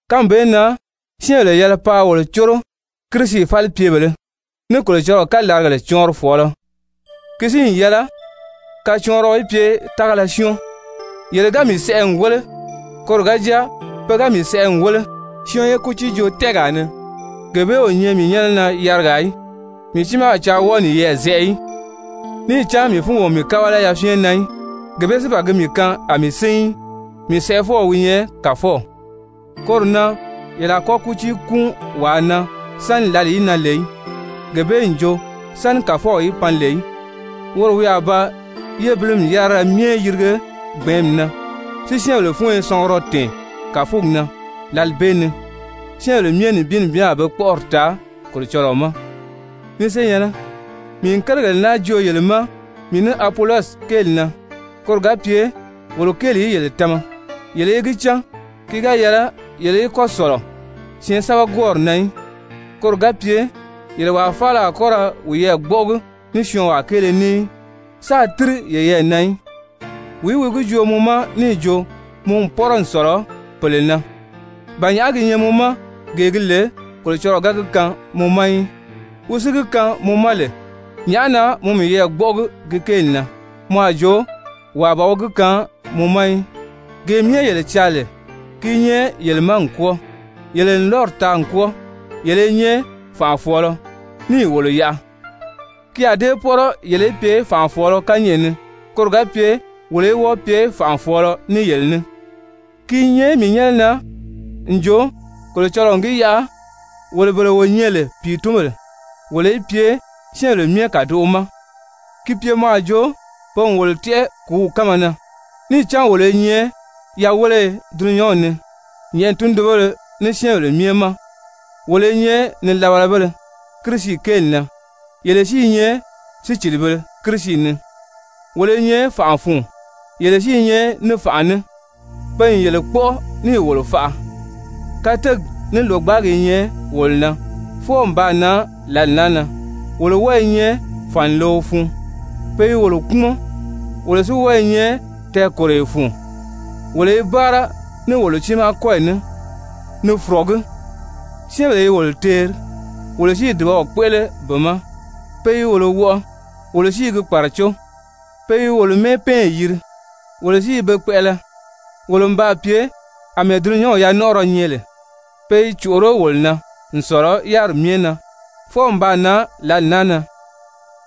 Kánmi bee na syɛ́ɛnbèle yɛlɛ paa wolo córo Kirisi falipyebèlē ní Kolocɔlɔɔ kalaragèle cɔɔnrifɔɔlɔ. Ki si n yɛlɛ kacɔɔnriɔ í pye tágala syɔ́ɔn. Yele ga mii sɛʔɛ n wéle, koro ga jáa pe ga mii sɛʔɛ n wéle syɔɔn ye kútiijoo-tɛ́ɛgaa ni, gee bee o nyɛ mii nyɛ́nɛ na yarigaa í. Mii tiimaa a caa wɔ́ɔ niyɛɛ zɛʔɛ í, níì cán mii fúngi o mii kábala yafyɛn na í. Gee bee si ban gi mii kaan a mii sín í. Mii sɛʔɛfɔw wi nyɛ Kàfɔw. Koro na yele a kɔ́ kútii kúun wàa na sáni lǎli í nan lè í, gee bee n jo sáni Kàfɔw í pan lè í, woro wi a ba yébilimi yárira myɛ yirige gbɛ̀ɛ́nmi na, si syɛ́ɛnbèle fúnyo sɔngurɔ tɛ̀ɛn kàfugi na. Lǎli bee ni syɛ́ɛnbèle myɛ nibin nibin a pe kpɔ́ʔɔri taa Kolocɔlɔɔ ma. Ni senyɛ̀nnɛ, mii n kérigèle naa joo yele ma mii ní Apolɔsi kéeli na koro ga pye wolo kéeli í yele tama yele í gi cán ki ga yɛlɛ yele í kɔ́ sɔ̀lɔ syɛɛnsɛbɛgwɔɔri na í, koro ga pye yele wàa faala a kɔ́ ra wiyɛɛ gbɔ́ʔɔgi ní syɔɔnwaa kéele ní í, sáā tíri yeyɛɛ na í. Wìí wi gi joo mɔ ma níì jo mɔ n pɔ́rɔ n sɔ̀lɔ pèle na? Ba nyàʔá gi nyɛ mɔ ma, gee gi lè Kolocɔlɔɔ ga gi kaan mɔ ma í? Wi si gi kaan mɔ ma lè, nyàʔá na mɔ miyɛɛ gbɔ́ʔɔgi gi kéeli na mɔ a jo wàa ban wi gi kaan mɔ ma í? Gee myɛ yele caa lè, ki i nyɛ yele ma n kwɔ́ɔ, yele n lɔ́ri taa n kwɔ́ɔ, yele i nyɛ fànʔafɔɔlɔ níì wolo yaʔa! Ki a dée pɔ́rɔ yele í pye fànʔafɔɔlɔ kányɛʔɛ ni, koro ga pye wolo í wɔ́ɔ pye fànʔafɔɔlɔ ní yele ní. Ki i nyɛ mii nyɛ́nɛ na n jo, Kolocɔlɔɔ n gi yaʔa wolo bele wo nyɛ lè pìitunbèle wolo í pye syɛ́ɛnbèle myɛ kàdoʔo ma, ki pye mɔ a jo pe n wolo tɛ́ʔɛ kùúw kánma na, níì cán wolo i nyɛ yaweleye dulunyanw ni, nyɛ̀ʔɛni tundunbéle ní syɛ́ɛnbèle myɛ ma. Wolo i nyɛ nilabalabéle Kirisi kéeli na, yele si i nyɛ sícilibēle Kirisi ni. Wolo i nyɛ fànʔa fun, yele si i nyɛ ní fànʔa ní. Pe n yele kpɔ́ʔɔ, níì wolo faʔa! Kateegi ní lògbaagi i nyɛ wolo na, fwɔɔ n baa nan lǎli naa na, wolo wɔ́ɔ i nyɛ fànileo fun, pe i wolo kpúmɔn, wolo si wɔ́ɔ i nyɛ tɛɛkòroyo fun. Wolo i báara ní wolo tiimaa kɔ́yi ní ni fɔ̀rɔgí. Syɛ́ɛnbèle i wolo teeri, wolo si i dùbaw kpéʔele be ma. Pe i wolo wɔʔɔ, wolo si i gi kpàracó. Pe i wolo mɛ́ɛpɛɛnyi yiri, wolo si i be kpɛʔɛlɛ. Wolo n baa pye àmɛɛ dulunyanw yanɔnʔɔrɔ nyɛ lè, pe i còʔoró wolo na n sɔ̀lɔ yáriri myɛ na, fwɔɔ n baa nan lǎli naa na.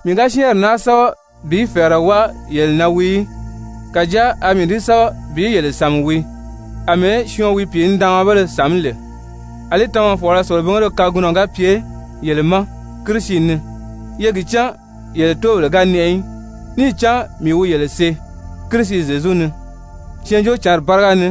Mii ga syɛ́ɛnri naa sɛ́bɛ bi fɛ̀ɛrɛ wáa yele na wii í. Kàjáa a mii di sɛ́bɛ bi yele sàmi wii, àmɛɛ syɔɔn wi pìinidaanmabéle sàmí lè. Alí tamafɔɔlɔ selebingéle kagunɔ ga pye yele ma Kirisi ni, ye gi cán yele tóobèle ga nɛʔɛ í, níì cán mii wi yele see Kirisi Zyezu ni Syɛɛnjóocǎnri báriga ni.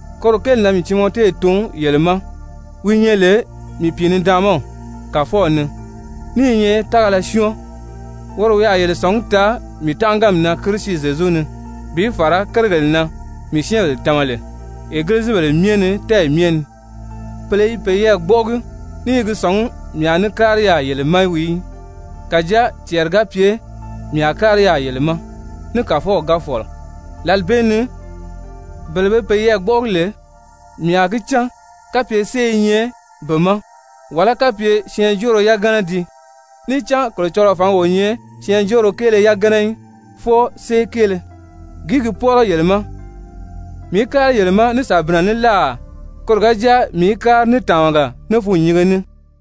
Koro kéeli na mii Timɔte tun yele ma, wi nyɛ lè mii pìinidaanmaw Kàfɔw ni, ní i nyɛ tágala syɔ́ɔn. Woro wi a yele sɔ̀ngí taa mii tánʔaganmi na Kirisi Zyezu ni, bi fàra kérigèle na mii syɛ́ɛnbèle tama lè egilizibèle myɛ ni tɛ́ɛyi myɛ ni. Pèle i peyɛɛ gbɔ́ʔɔgi ní i gi sɔ̀ngí mii a ní kári yaà yele ma wii í. Kàjáa cɛɛri ga pye mii a kári yaà yele ma, ní Kàfɔw ga fɔ̀lɔ, lǎli bee ni bele be peyɛɛ gbɔ́ʔɔgi lè, mii a gi cán kapye sée i nyɛ be ma, wàlá kapye syɛɛnjóoro yagana dii. Níì cán Kolocɔlɔɔ fǎngi o nyɛ syɛɛnjóoro kéele yagana í, fwɔɔ sée kéele. Gìí gi pɔ́rɔ yele ma? Mii í kári yele ma ní sàbinnɛ ní láà, koro ga jáa mii í kári ní tàmaga, ní fûnnyinge ní?